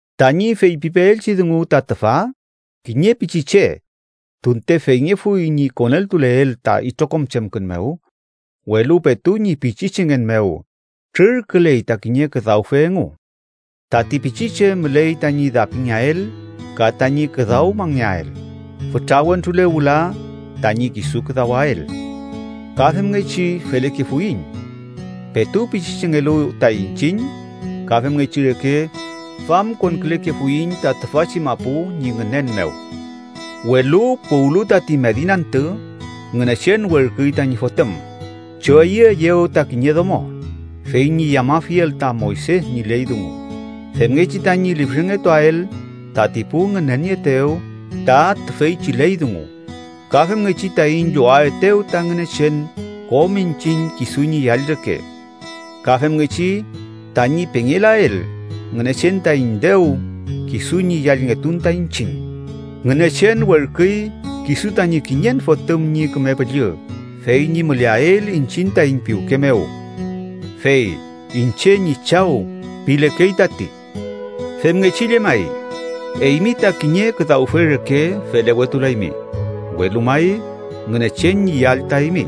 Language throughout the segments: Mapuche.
Tañi feypipeelchi dungu ta tüfa: kiñe pichiche, tunte feyngefuy ñi koneltuleel ta itrokom chemkün mew, welu petu ñi pichichengen mew trürküley ta kiñe küdawfe engu. Tati pichiche müley tañi dapingeael ka tañi küdawmangeael, fütra wentrule wüla tañi kisu küdawael. Ka femngechi felekefuiñ. Petu pichichengelu ta iñchiñ, ka femngechi reke famkonkülekefuiñ ta tüfachi mapu ñi ngünen mew. Welu puwlu tati mediñ antü, Ngünechen werküy tañi Fotüm, choyüeyew ta kiñe domo, fey ñi yamafiel ta Moyse ñi ley dungu femngechi tañi lifrengetuael tati pu ngünenieetew ta tüfeychi ley dungu, ka femngechi taiñ llowaetew ta Ngünechen kom iñchiñ kisu ñi yall reke. Ka femngechi tañi pengelael Ngünechen taiñ dew kisu ñi yallngetun ta iñchiñ, Ngünechen werküy kisu tañi kiñen Fotüm ñi Küme Püllü fey ñi müleael iñchiñ taiñ piwke mew. Fey “¡Iñche ñi Chaw!” pilekey tati. Femngechi llemay, eymi ta kiñe küdawfe reke felewetulaymi, welu may Ngünechen ñi yall ta eymi.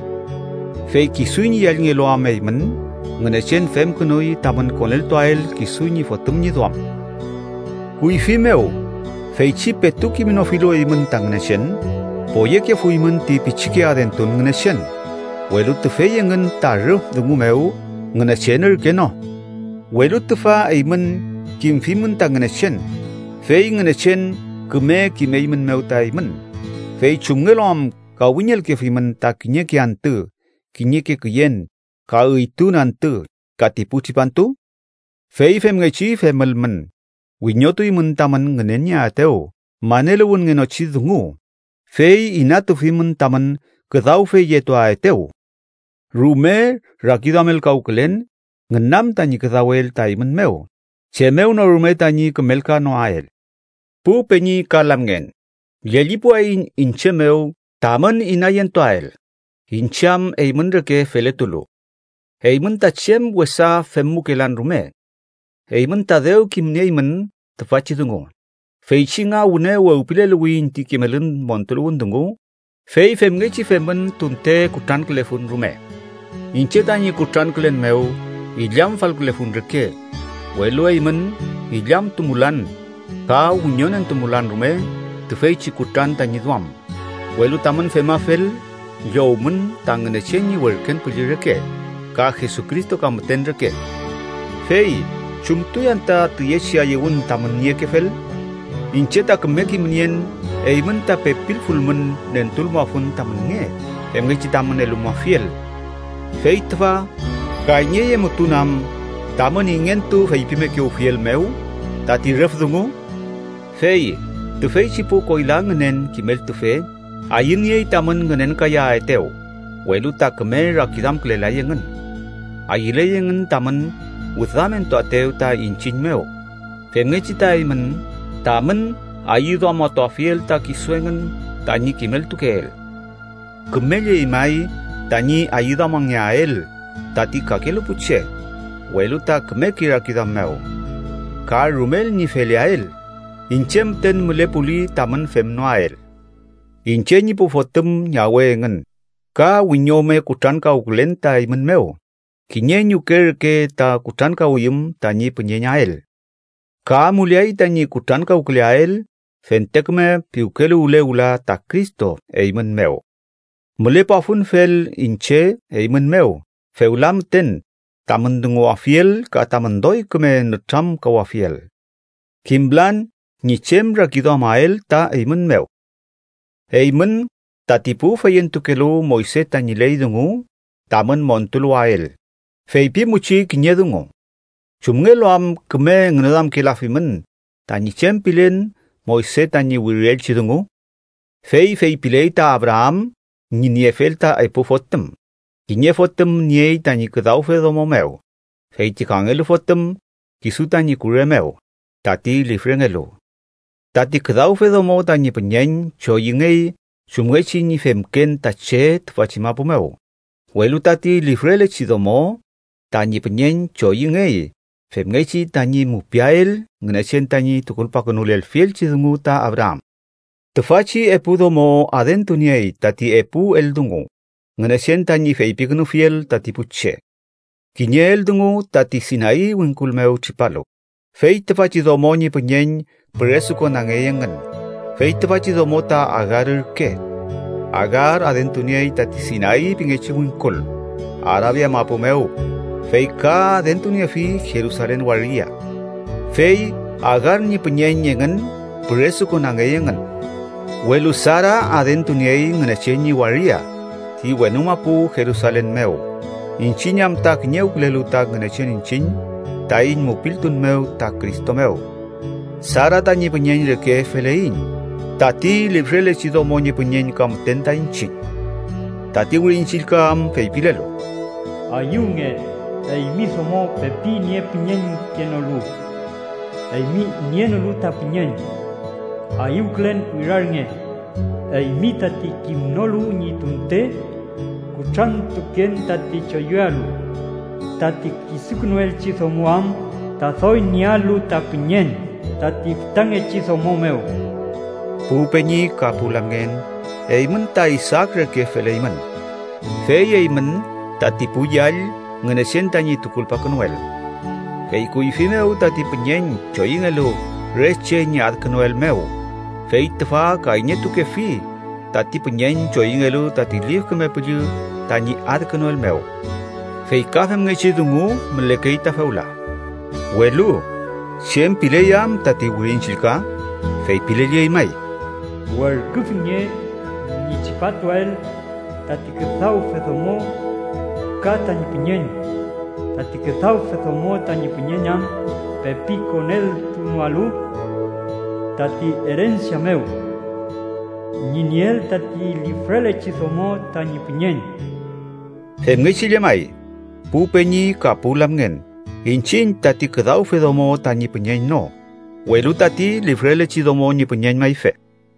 Fey kisu ñi yallngelu am eymün, Ngünechen femkünuy tamün koneltuael kisu ñi Fotüm ñi duam. Kuyfi mew, feychi petu kimnofilu eymün ta Ngünechen, poyekefuymün ti pichike adentun ngünechen, welu tüfey engün ta rüf dungu mew Ngünechen ürke no. Welu tüfa eymün kimfimün ta Ngünechen, fey Ngünechen küme kimeymünmew ta eymün, ¿fey chumngelu am kawiñelkefimün ta kiñeke antü, kiñeke küyen, ka üytun antü ka ti pu tripantu? Fey femngechi femülmün, wiñotuymün tamün ngünenieaetew maneluwünngenochi dungu, fey inatufimün tamün küdawfeyetuaetew. ¡Rume rakiduamelkawkülen ngünam tañi küdawel ta eymün mew chem mew no rume tañi kümelkanoael! Pu peñi ka lamngen, llellipuwayiñ iñche mew tamün inayentuael, iñche am eymün reke feletulu. Eymün ta chem wesa femmukelan rume. Eymün ta dew kimnieymün tüfachi dungu, feychi nga wüne wewpileluwiyiñ ti kimelün montuluwün dungu, fey femngechi femün tunte kutrankülefun rume. Iñche tañi kutrankülen mew illamfalkülefun reke, welu eymün illamtumulan ka wiñonentumulan rume tüfeychi kutran tañi duam, welu tamün femafel, llowmun ta Ngünechen ñi werken püllü reke, ¡ka Jesucristo ka müten reke! ¿Fey chumtuy anta tiyechi ayüwün tamün niekefel? Iñche ta küme kimnien eymün ta pepilfulmün nentulmuafun tamün nge femngechi tamün elumuafiel. Fey tüfa, ¿kayñeyemutun am, tamün ingentu feypimekewfiel mew tati rüf dungu? Fey tüfeychi pu koyla ngünen kimeltufe ayüniey tamün ngünenkayaetew, welu ta küme rakiduamkülelay engün. Ayüley engün tamün wüdamentuaetew ta iñchiñ mew, femngechi ta eymün tamün ayüduamatuafiel ta kisu engün tañi kimeltukeel. Kümelley may tañi ayüduamangeael tati kakelu pu che, welu ta kümeke rakiduam mew. Ka rumel ñi feleael, iñche müten mülepuli tamün femnoael. Iñche ñi pu fotüm ñawe engün, ka wiñome kutrankawkülen ta eymün mew, kiñe ñuke reke ta kutrankawiyüm tañi püñeñael. Ka amuleay tañi kutrankawküleael fente küme piwkeluwle wüla ta Cristo eymün mew. Mülepuafunfel iñche eymün mew fewla müten, tamün dunguwafiel ka tamün doy küme nütramkawafiel. ¡Kimlan ñi chem rakiduamael ta eymün mew! Eymün, tati pu feyentukelu Moyse tañi ley dungu tamün montuluwael, feypimuchi kiñe dungu: ¿chumngelu am küme ngüneduamkelafimün tañi chem pilen Moyse tañi wirielchi dungu? Fey feypiley ta Abraam ñi niefel ta epu fotüm: Kiñe fotüm niey tañi küdawfe domo mew, fey ti kangelu fotüm kisu tañi kure mew, tati lifrengelu. Tati küdawfe domo tañi püñeñ choyüngey chumngechi ñi femken ta che tüfachi mapu mew, welu tati lifrelechi domo tañi püñeñ choyüngey femngechi tañi mupiael Ngünechen tañi tukulpakünulelfielchi dungu ta Abraam. Tüfachi epu domo adentuniey tati epu eldungu Ngünechen tañi feypikünufiel tati pu che. Kiñe eldungu tati Sinay wingkul mew tripalu, fey tüfachi domo ñi püñeñ püresukonangey engün. Fey tüfachi domo ta Agar ürke. Agar adentuniey tati Sinay pingechi wingkul, Arabia mapu mew, fey ka adentuniefi Jerusalen waria. Fey Agar ñi püñeñ engün püresukonangey engün. Welu Sara adentuniey Ngünechen ñi waria ti wenu mapu Jerusalen mew iñchiñ am ta kiñewkülelu ta Ngünechen iñchiñ taiñ mupiltun mew ta Cristo mew. Sara tañi püñeñ reke feleiñ, tati lifrelechi domo ñi püñeñ ka müten ta iñchiñ. Tati Wirin Chillka am feypilelu: “Ayüwnge, eymi domo pepi niepüñeñkenolu, eymi nienolu ta püñeñ; Ayüwkülen wirarnge, eymi tati kimnolu ñi tunte kutrantuken tati choyüalu. Tati kisukünuelchi domo am ta doy niealu ta püñeñ tati fütangechi domo mew.” Pu peñi ka pu lamngen, eymün ta Isaak reke feleymün. Fey eymün tati pu yall Ngünechen tañi tukulpakünuel. Fey kuyfi mew tati püñeñ choyüngelu re che ñi adkünuel mew, fey tüfa kayñetukefi tati püñeñ choyüngelu tati Lif Küme Püllü tañi adkünuel mew. Fey ka femngechi dungu mülekey ta fewla. Welu ¿chem piley am tati Wirin Chillka? Feypilelley may: “Werküfinge ñi tripatuael tati küdawfe domo ka tañi püñeñ, tati küdawfe domo tañi püñeñ am pepi koneltunoalu tati erensia mew ñi nieel tati lifrelechi domo tañi püñeñ.” Femngechi llemay, pu peñi ka pu lamngen, iñchiñ tati küdawfe domo tañi püñeñ no, welu tati lifrelechi domo ñi püñeñ mayfe.